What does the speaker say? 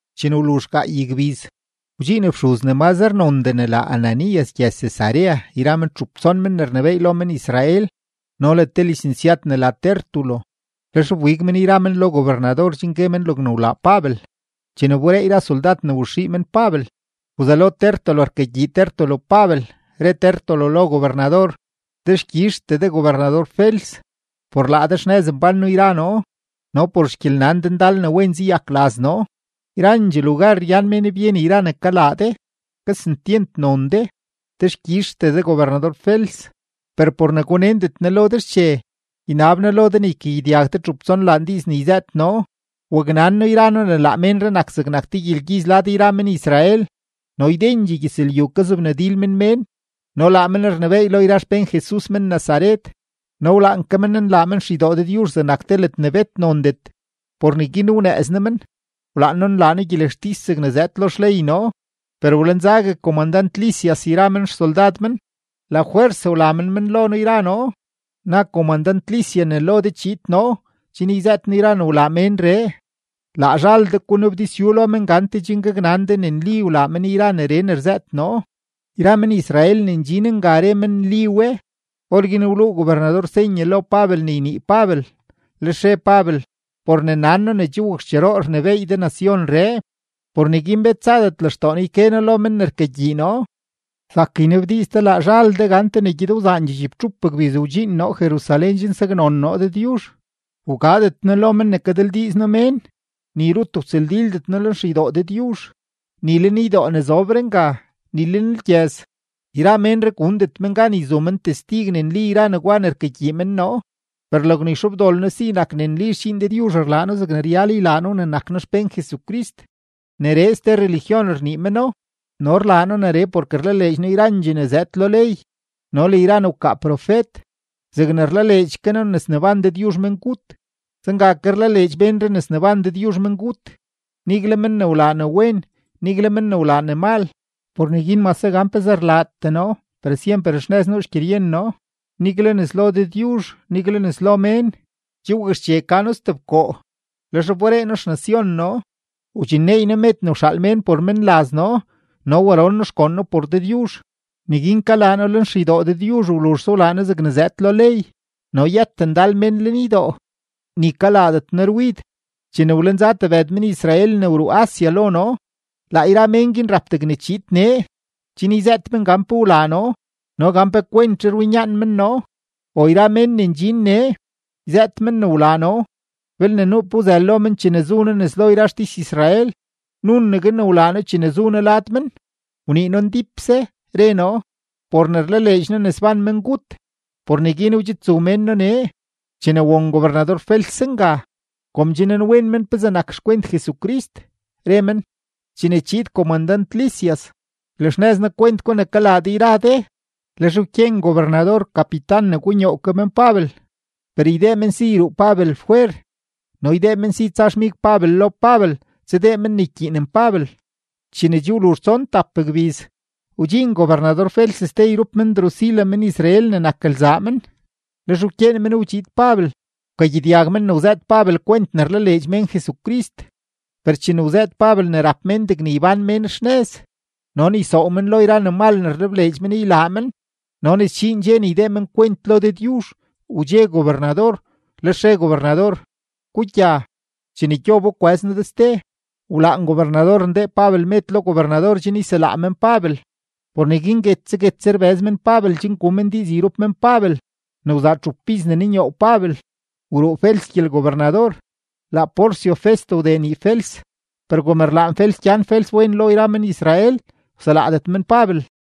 Chene wluzh gaay gbiz, wdxiin fxuz ne mazre nondee ne la Ananías gyëz-Cesarea yra men txup tson men ne rnebééy lo men-Israel no le te lisensyad ne la Tértulo. Lex wbig men yra men lo gobernador chen gue men logne wlaa Pabel. Chene wberee yra soldad ne waxii men Pabel, wzelo Tértulo rkagyii Tértulo Pabel, re Tértulo lo gobernador: ―Dexkyizhtee de gobernador-Fels, por laa de xnëz mbán noo yra noo no por xgyelnan de ndal ne wen zayak laz noo. Yrandxee lugar ryan mén byen yra ne kalaa de. Kesentyent non de, dexkyizhtee de gobernador-Fels. Per por ne gunendet noo lo de xche, ynab noo lo de ne ykagyedyag de txup tsonlaan diiz ne yzëët noo. Waknan noo yra noo ne laa ménree nak zegnak te gyelgyiz lad yra men-Israel, no ydendxee gyëzlyu kazobnadil men mén, no laa men rnebééy lo yra xpén Jesus men-Nazaret. No wlaan ke men nlaa men xeydoo Dëdyuzh zegnak te ledne bet nondet. Por neguin wnëëz noo men, wlaan noo nlaa noo gyelextis zegne zëëd lo xley noo. Per wlenzague komandant-Lisias yra men xsoldad men, lafwers wla men men lo noo yra noo. Na komandant-Lisias ne lo de chiid noo chen yzëët noo yra ne wlaa ménree. Laa zhal de gunabdizyu lo men gante chen gaknan de ne nli wlaa men yra neree ne rzëët noo. Yra men-Israel ne ndxin nga re men ne nli we. Orguin wluu gobernador senye lo Pabel ne ynii Pabel, lex re Pabel: ―Por ne nan noo ne che wakxcheroo rnebééy de nacionree, por neguin bet zadet lextoo noo yke noo lo men ne rkagyii noo. Zak ynabdiiz de laa zhal de gante ne gyed wzaandxee chibtxup gbiz wdxiin noo Jerusalén chen saknon noo Dëdyuzh. Wgadet noo lo men ne kadildiiz noo mén, ni rut wtsëldildet noo lenxeydoo Dëdyuzh, ni lenydoo ne zobre nga, ni lenlgyëz. Yra ménree gundet men gan yzu men testig ne nli yra negwa ne rkagyii men noo. Per logne yxobdol noo si nak ne nli xdxiin Dëdyuzh rlaa noo zegne ryal ne ylaa noo ne nak noo xpén Jesucrist; neree ste religión rnii meno, no rlaa noo neree porke rlaleedx noo yrandxee ne zëëd lo ley no le yra ne wkaa profet. Zegne rlaleedx ke noo ne sneban Dëdyuzh mengut, zenga ke rlaleedx ménree ne sneban Dëdyuzh mengut, nigle men ne wlaa ne wen, nigle men ne wlaa ne mal. Por neguin mase gan pezee rlaatee noo, per syemper xnëz nuu xgyeryen noo, nigle nes lo Dëdyuzh, nigle nes lo mén. ’Che wakxche ka noo stebkoo, lex wberee noo xnacion noo, wdxinneey noo med ne wxaal mén por menlaz noo no waron noo xgoon noo por Dëdyuzh. Neguin kalaa noo lenxeydoo Dëdyuzh, wluzhse wlaa noo zegne zëëd lo ley, no yët ndal mén lenydoo, ni kalaadet noo rwid, chene wlenza tebëd men-Israel ne wruu Asia lo noo. Laa yra mén guin rap degne chiid nee, chen yzëët men gan pe wlaa noo no gan pe kwentzhe rwinyaan men noo. O yra mén ne ndxin nee, yzëët men ne wlaa noo belne nuu pe wzël lo men chene zu noo nes lo yra xtis-Israel. Nunegue ne wlaa noo chene zu noo lad men, wnii noo ndípse, re noo: “Por ne rlaleedx noo ne sban mengut, por neguin wdxidzu mén noo nee.” Chene won gobernador-Fels zenga, kom che nanwen men pezee nak xkwent Jesucrist, re men: ―Chene chiid komandant-Lisias, ylaxnëz noo kwent gwa ne kalaa de yra de. Lex wkyeen gobernador kapitan ne gunyoow ke men Pabel, per ydee men si yruu Pabel fwer no ydee men si tsa xmig Pabel lo Pabel tsadee men ne rkyiinen Pabel. Chene che wluzh tson tap gbiz, wdxiin gobernador-Fels ste yrup men Drusila men-Israel ne nak lzaa men. Lex wkyeen men wdxiid Pabel, wkagyedyag men ne wzëët Pabel kwent ne rlaleedx mén Jesucrist. Per chene wzëët Pabel ne rap mén degne ybán mén xnëz no ne ysoow men lo yra ne mal ne rlebleedx men ylaa men no ne sdxiin dxe ne ydee men kwent lo Dëdyuzh, wdxe gobernador, lex re gobernador: ―Gugya. Chene gyobo kwëz noo de ste. Wlaan gobernador ndee Pabel med lo gobernador chen yselaa men Pabel. Por neguin guetse guetse rbëz men Pabel chen gu men diiz yrup men Pabel. Ne wzaa txup iz ne nunyoow Pabel, wruu Fels gyelgobernador, laa Porcio Festo wdee nii Fels. Per kom rlaan Fels gyan Fels wen lo yra men-Israel, wselaadet men Pabel.